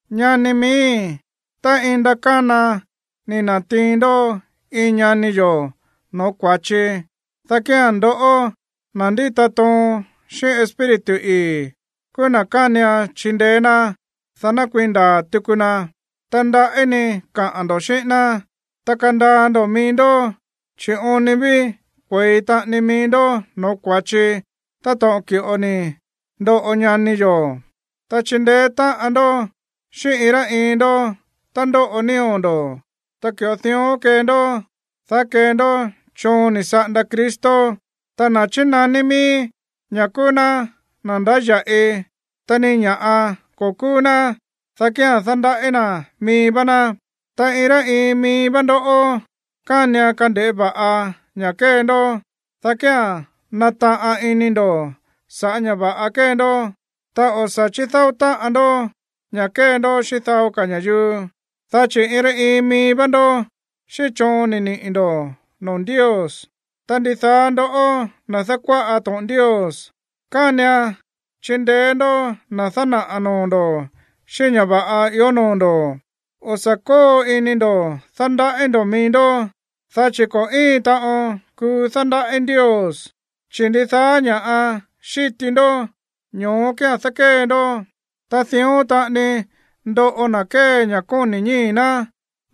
Ñani miíi̱, tá iin ndakána ni̱ na̱tiin ndó iin ñani yo̱ no̱ó kua̱chi, dá kía̱n ndoꞌó, na̱ ndíta toon xíꞌín Espíritu ii̱, kúú na̱ kánian chindeé ná, dá ná kuii̱n ndaa̱ tuku na. Ta ndaꞌí ni kaꞌa̱n ndo̱ xíꞌín ná, ta kandaa ndo̱ mií ndó, chi̱ oon ni ví kue̱i taꞌani mií ndó no̱ó kua̱chi táto̱ꞌon ki̱ꞌo ni̱ ndoꞌo ñani yo̱. Ta chindeé táꞌan ndó xíꞌín iin rá iin ndó tá ndóꞌo nío̱ ndo̱, ta ki̱ꞌo dión kee ndó, dá kee ndó choon ni̱ saꞌanda Cristo. Ta na̱ chínaní míí ña̱ kúú ná na̱ ndáya̱ꞌi, ta ni iin ña̱ꞌa ko̱ kúú ná, dá kía̱n dándaꞌí na̱ mií vá ná. Ta iin rá iin mií vá ndó kánian kande̱ꞌé va̱ꞌa ña̱ kée ndó, dá kía̱n nataꞌan ini ndo̱ sa̱ꞌá ña̱ va̱ꞌa kée ndó. Ta o̱ sa̱ chídáó táꞌan ndó ña̱ kée ndó xíꞌín dao ka̱ ña̱yuu. Dá chi̱ iin rá iin mií vá ndó xíꞌín choon ni̱ niꞌi̱ ndo̱ noo̱ Ndios. Ta ndidaá ndoꞌó, na̱ dákuáꞌa to̱ꞌon Ndios, kánian chindeé ndó na̱ dánaꞌa̱ noo̱ ndo̱ xíꞌín ña̱ va̱ꞌa ió noo̱ ndo̱. O̱ sa̱ kóo ini ndo̱ dándaꞌí ndo̱ mií ndó, dá chi̱ ko̱ íin taꞌon kuu dándaꞌí Ndios, chi̱ ndidaá ña̱ꞌa xíti ndó, ño̱ó kía̱n dákée ndó. Ta dión taꞌani ndoꞌo na̱ kée ña̱ kóni̱ ñíi̱ ná,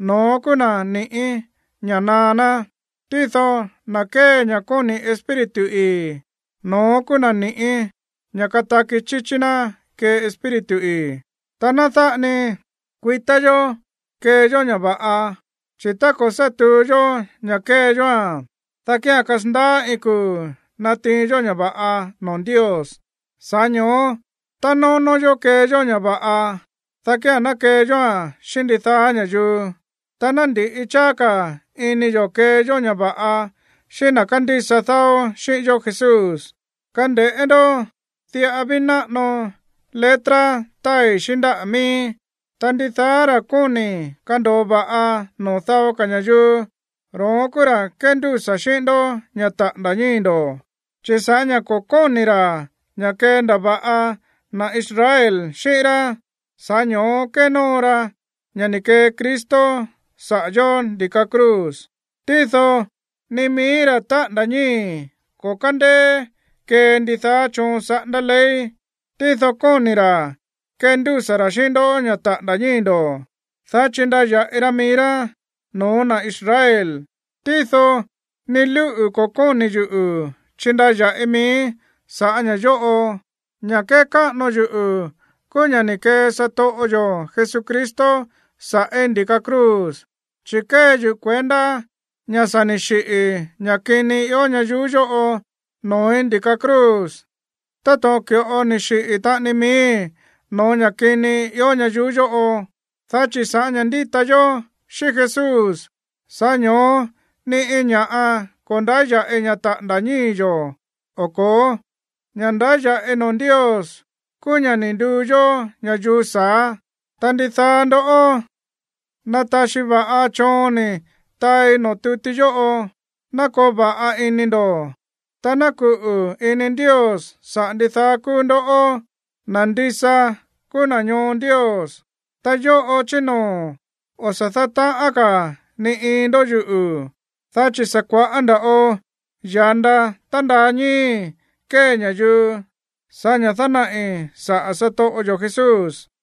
no̱ón kúú na̱ ni̱ꞌí ña̱ naá ná. Tído na̱ kée ña̱ kóni̱ Espíritu ii̱, no̱ón kúú na̱ ni̱ꞌí ña̱ kataki chíchí ná kee Espíritu ii̱. Ta ná dáꞌa ni kuitá yo̱ kee yó ña̱ va̱ꞌa, chi̱ tá ko̱ sá tuu yó ña̱ kée yóa̱n, dá kía̱n kasandaá iin kuu̱ natiin yó ña̱ va̱ꞌa noo̱ Ndios. Sa̱ꞌá ño̱ó tá nónó yó kee yó ña̱ va̱ꞌa, dá kía̱n ná kee yóa̱n xíꞌín ndidaá ña̱yuu. Ta ná ndi̱ꞌi cháá ka̱ ini yo̱ kee yó ña̱ va̱ꞌa xíꞌín na̱ kándísa dáó xíꞌín yó Jesús. Kande̱ꞌé ndó, diꞌa ví náꞌano letra táai xíꞌín ndáꞌa̱ miíí. Ta ndidaá ra̱ kóni̱ kando̱o va̱ꞌa noo̱ dao ka̱ ña̱yuu, ro̱ón kúú ra̱ kéndúsa̱ xíꞌín ndó ña̱ taꞌa̱nda̱ ñíi̱ ndo̱. Chi̱ sa̱ꞌá ña̱ ko̱ kóni̱ ra̱ ña̱ kendava̱ꞌa na̱ Israel xíꞌín rá, sa̱ꞌá ño̱ó kénóo ra ña̱ ni̱ kee Cristo saꞌa̱ yo̱ ndi̱ka cruz. Tído ni mií ra̱ ni̱ taꞌa̱nda̱ ñíi̱ ko̱ kándéé kee ndidaá choon saꞌándá ley. Tído kóni̱ ra̱ kendúsa̱ ra̱ xíꞌín ndó ña̱ taꞌa̱nda̱ ñíi̱ ndo̱, dá chindaya̱ꞌi ra mií rá no̱ó na̱ Israel. Tído ni lúꞌu̱ ko̱ kóni̱ yuꞌu̱ chindaya̱ꞌi miíí sa̱ꞌá ña̱ yóꞌo. Ña̱ kékáꞌano yuꞌu̱ kúú ña̱ ni̱ kee satoꞌo yo̱ Jesucristo sa̱ꞌí ndi̱ka cruz. Chi̱ kée yuꞌu̱ kuendá ña̱ sa̱ ni̱ xiꞌi̱ ña̱ kini ió ñayuú yóꞌo noo̱í ndi̱ka cruz táto̱ꞌon ki̱ꞌo ni̱ xiꞌi̱ taꞌani miíi̱ no̱ó ña̱ kini ió ñayuú yóꞌo. Dá chi̱ sa̱ꞌá ña̱ ndíta yó xíꞌín Jesús, sa̱ꞌá ño̱ó ni iin ña̱ꞌa ko̱ ndáya̱ꞌi ña̱ taꞌa̱nda̱ ñíi̱ yo̱ o ko̱ó. Ña̱ ndáya̱ꞌi noo̱ Ndios kúú ña̱ ni̱ nduu yó ña̱yuu sa̱á. Ta ndidaá ndoꞌó, na̱ taxi va̱ꞌa choon ni̱ taai noo̱ tuti yóꞌo, ná koo va̱ꞌa ini ndo̱, ta ná kuꞌu̱ ini Ndios saꞌa̱ ndidaá kúú ndoꞌó, na̱ ndisa kúú na̱ ñoo Ndios. Ta yóꞌo chí noo̱ o̱ sa̱ dátaꞌán ka̱ ni iin ndó yuꞌu̱, dá chi̱ sa̱ kua̱ꞌá nda̱ꞌo ya̱nda tándaa ñíi̱í kée ña̱yuu sa̱ꞌá ña̱ dánaꞌi̱ saꞌa̱ satoꞌo yo̱ Jesús.